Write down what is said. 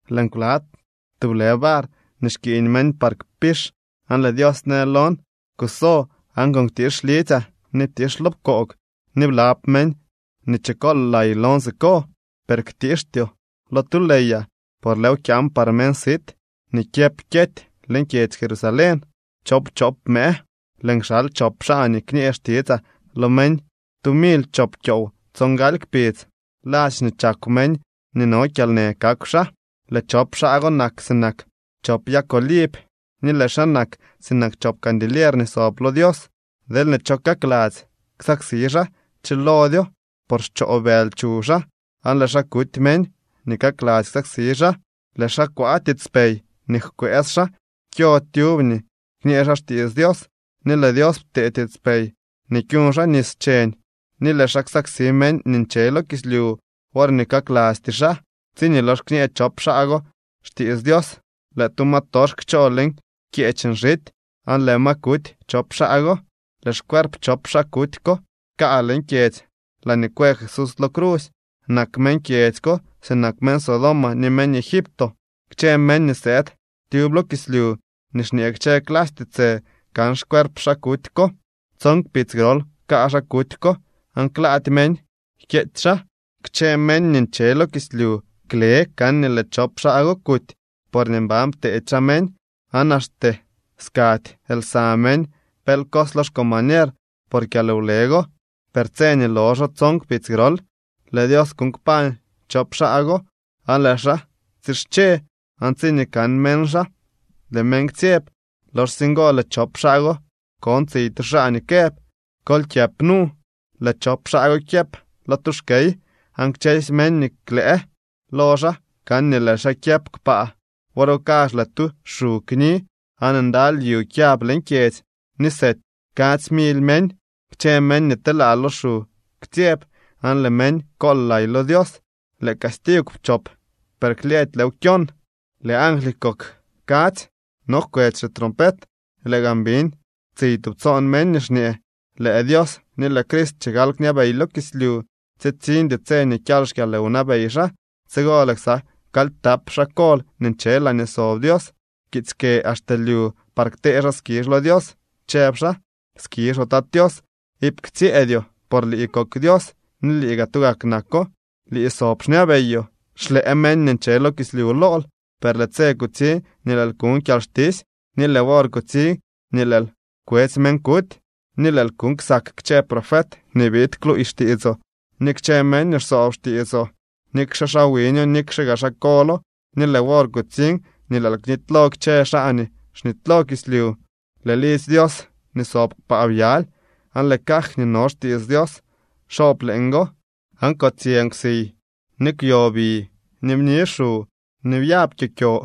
Lëën kwa tublë var nii xkiiñ meñ par kpix aan lëë Dios në lon: —Kuso aan kuktiix lidzyaa ni ptiix lo pkoog, ni blab meñ nii chikool lay lon siko. Per ktiixtyoo lo tu leeyaa, por lëëw kyaan par meñ sit nii kyëp kyety leñ kyedzy Jerusalén choowpchop mëë. Lëën kxal chop xaa nii kñee xtitsaa lo meñ tu mily chop kyoow tsongaly kpidz. Ladx nii chakw meñ nii no kyalnë kakw xaa. Lëë chop xaa go nak sinak chop yag oliv ni lëë xaa nak sinak chop candilier nii sob lo Dios. Deelñee cho kakladzy ksaksi xaa, chilodyo por xchoo bëly chuw xaa aan lëë xaa kuty meñ nii kakladzy ksaksi xaa. Lëë xaa kwaa tiitspey nii jkwëës xaa kyo tyub nii kñee xaa xtiits Dios, ni lëë Dios ptee tiitspey nii kyuñ xaa nis cheñ ni lëë xaa ksaksi meñ nii nche lo kislyu worñee kaklastyee xaa. Tsiñee lox kñee chop xaa go xtiits Dios lëë tu ma tox kchoo leñ kyeech nxity, aan lëë ma kuty chop xaa go. Lëë xcuerp chop xaa kuty ko kaa leñ kyedzy laañee kwë Jesús lo crusy. Nak meñ kyedzy ko sinak meñ Sodoma ni meñ Egipto. Kchë meñ nii sëëd tyub lo kislyu ni xñee kchë clasy tiitsë kan xcuerp xaa kuty ko. Tson kpidz grol kaa xaa kuty ko aan klaady meñ jkyeetsy xaa. Kchë meñ nii nche lo kislyu kle kan nii lëë chop xaa go kuty, porñee mban pteedy xaa meñ, aan axte skady lsa meñ pel cos lo xcombañer por kyalwle go. Per tse nii loxo tson kpidz grol lëë Dios kuuñ kpañ chop xaa go aan lëë xaa tsische. Aan tsiñee kan meñ xaa, lëë meñ ktsyeb. Loxsye ngo lëë chop xaa go kon tsiy tu xaa nii këb: —Kol kyëp nu. Lëë chop xaa go kyëp lo tu xkey aan kchësy meñ nii klëë lo xaa kan nii lëë xaa kyëp kpaa. Wor go kazh lëë tu xu kni aan ndaly yu kyab leñ kyedzy ni sety kadzy mily meñ. Kchë meñ nii telaa lo xu ktsyeb aan lëë meñ kool lay lo Dios. Lëë castigw pchop, per klyëëdy lëëw kyon. Lëë angly kok kadzy no jkwetsy xitrompet. Lëë gaan biñ tsiy tubtsoon meñ nii xñee: Lëë Dios ni lëë Crist chigal kñabey lo kislyu, tsitsiñdy tse nii kyal xkyalwnabey xaa. Tsigo lëë ksa kalyptap xaa kol nii nche laañee sob Dios pkiitsy kë axte lyu par ktee xaa skizh lo Dios, chëb xaa: Skizhoo, Tat Tios, iip ktsyëëdyoo por lii kok Dios ni lii gaa tugak nako. Lii sob xñabeyoo. Xlëë meñ nii nche lo kislyu lool, per lëë tse kutsiñ nii lëël kuñ kyalxtisy, ni lëë wor kutsiñ nii lëël kwetsy meñ kuty, ni lëël kuñ ksak kchë profet nii biid kluuy xtiitsoo ni kchë meñ nii xsoob xtiitsoo, nikxe xaa wiño, nikxe gaa xaa kolo. Ni lëë wor kutsiñ nii lëël knitylo kchë xaa nii xnitylo kislyu. Lëë lidzy Dios nii sob kpaa byaly, aan lëë caj nii no xtiits Dios xoob leeñgo, aan kotsyë nkwsiy, ni kwyo bi, ni bni xu ni byab kyokyo.